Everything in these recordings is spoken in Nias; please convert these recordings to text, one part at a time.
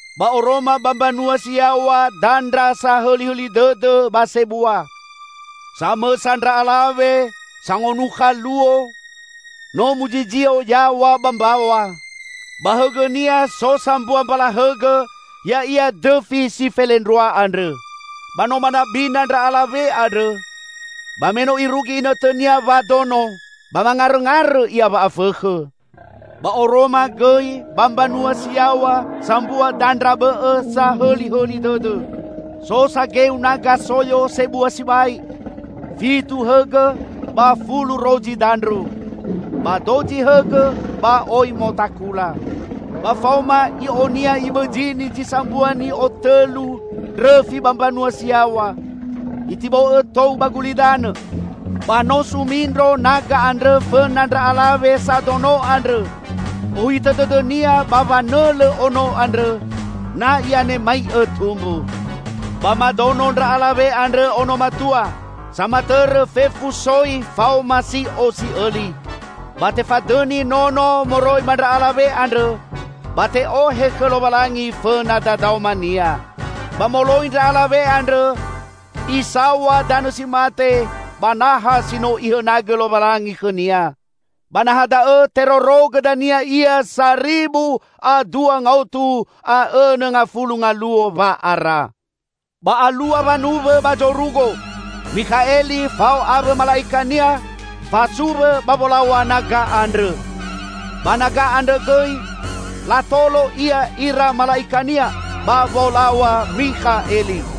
Ba oroma ba mbanua si yaw̃a dandra sahõlihõli dõdõ ba sebua. Samõsa ndra alawe sangonukha luo, no muzizio yaw̃a ba mbaw̃a. Ba hõgõnia so sambua mbala hõgõ ya'ia dõfi si felendrua andrõ. Ba no manabina ndra alawe andrõ, ba me no irugi inõtõnia wadono, ba mangarõngarõ ia wa'afõkhõ. Ba oroma gõi ba mbanua si yaw̃a sambua dandra bõ'õ sahõlihõli dõdõ. So sageu naga soyo sebua sibai, fitu hõgõ ba fulu rozi dandru. Ba dozi hõgõ ba oi motakula. Ba faoma i'onia ibõzini zi sambua ni'otõlu ndrõfi ba mbanua si yaw̃a, itibo'õ tou ba gulidanõ. Ba no sumindro naga andrõ fõna ndra alawe sadono andrõ, ohitõ dõdõnia ba wanõlõ ono andrõ, na i'anemai'õ tumbu. Ba madono ndra alawe andrõ ono matua, samatõrõ fefu soi faoma si'o si'õli. Ba tefadõni nono moroi ba ndra alawe andrõ, ba te'ohe khõ Lowalangi fõna dadaoma-Nia. Ba moloi ndra alawe andrõ isaw̃a danõ si mate, ba naha si no Ihõnagõ Lowalangi khõnia. Ba naha da'õ terorogõ dania ia saribu a dua ngaotu a õnõ ngafulu ngaluo wa'ara. Ba alua wanuwõ ba zorugo. Mikhaeli fao awõ mala'ikania fasuwõ ba wolaw̃a naga andrõ. Ba naga andrõ gõi latolo ia ira mala'ikania, ba wolaw̃a Mikhaeli.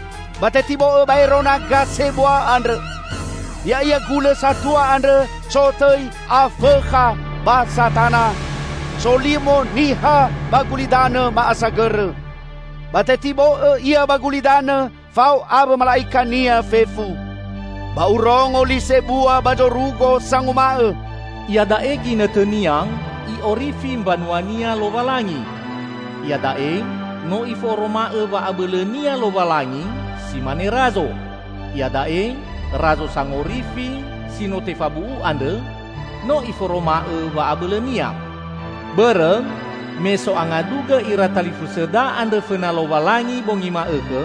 Ba tetibo'õ baero naga sebua andrõ! Ya'ia gulõ satua andrõ sotõi Afõkha ba Satana, solimo niha ba gulidanõ ma'asagõrõ. Ba tetibo'õ ia ba gulidanõ fao awõ mala'ikania fefu. Ba urongo li sebua ba zorugo sanguma'õ, "Iada'e ginõtõnia I'orifi mbanua-Nia Lowalangi! Iada'e no Iforoma'õ wa'abõlõ-Nia Lowalangi si mane Razo! Iada'e Razo Sangorifi, si no tefabu'u andrõ no Iforoma'õ wa'abõlõ-Nia! Bõrõ me so'angadugõ ira talifusõda andrõ fõna Lowalangi bongi ma'õkhõ,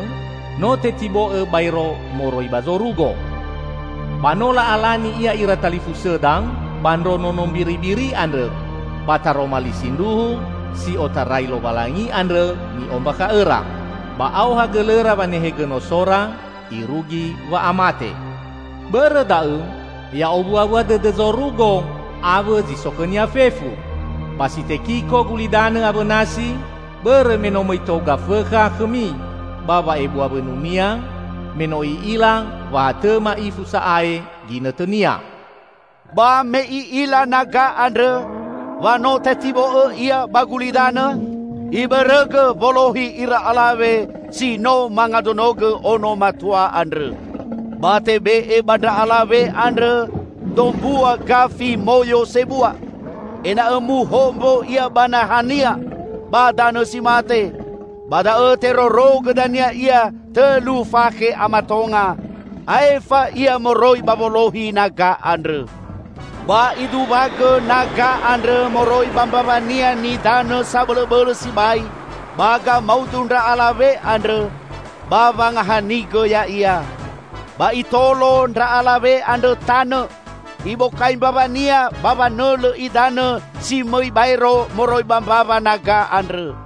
no tetibo'õ baero moroi ba zorugo. Ba no la'alani ia ira talifusõda ba ndro Nono Mbiribiri andrõ, ba taroma li sindruhu si otarai Lowalangi andrõ ni'ombakha'õra. Ba aoha gõlõra wanehegõ nosora irugi wa'amate. Bõrõ da'õ, ya owuawua dõdõ zorugo awõ zi so khõnia fefu! Ba si tekiko gulidanõ awõ nasi, bõrõ me no mõi tou Gafõkha khõmi ba wa'ebua wõnunia, me no i'ila wa ha tõ ma'ifu sa'ae ginõtõnia." Ba me i'ila naga andrõ wa no tetibo'õ ia ba gulidanõ, ibõrõgõ wolohi ira alawe si no mangadonogõ ono matua andrõ. Ba tebe'e ba ndra alawe andrõ dombua gafi moyo sebua, ena'õ muhombo ia ba nahania ba danõ si mate, ba da'õ terorogõ dania ia tõlu fakhe a matonga, aefa ia moroi ba wolohi naga andrõ. Ba iduwagõ naga andrõ moroi ba mbawania nidanõ sabõlõbõlõ sibai ba gamaudu ndra alawe andrõ, ba wangahanigõ ya'ia. Ba itolo ndra alawe andrõ tanõ; ibokai mbawania ba wanõlõ idanõ si mõi baero moroi ba mbawa naga andrõ.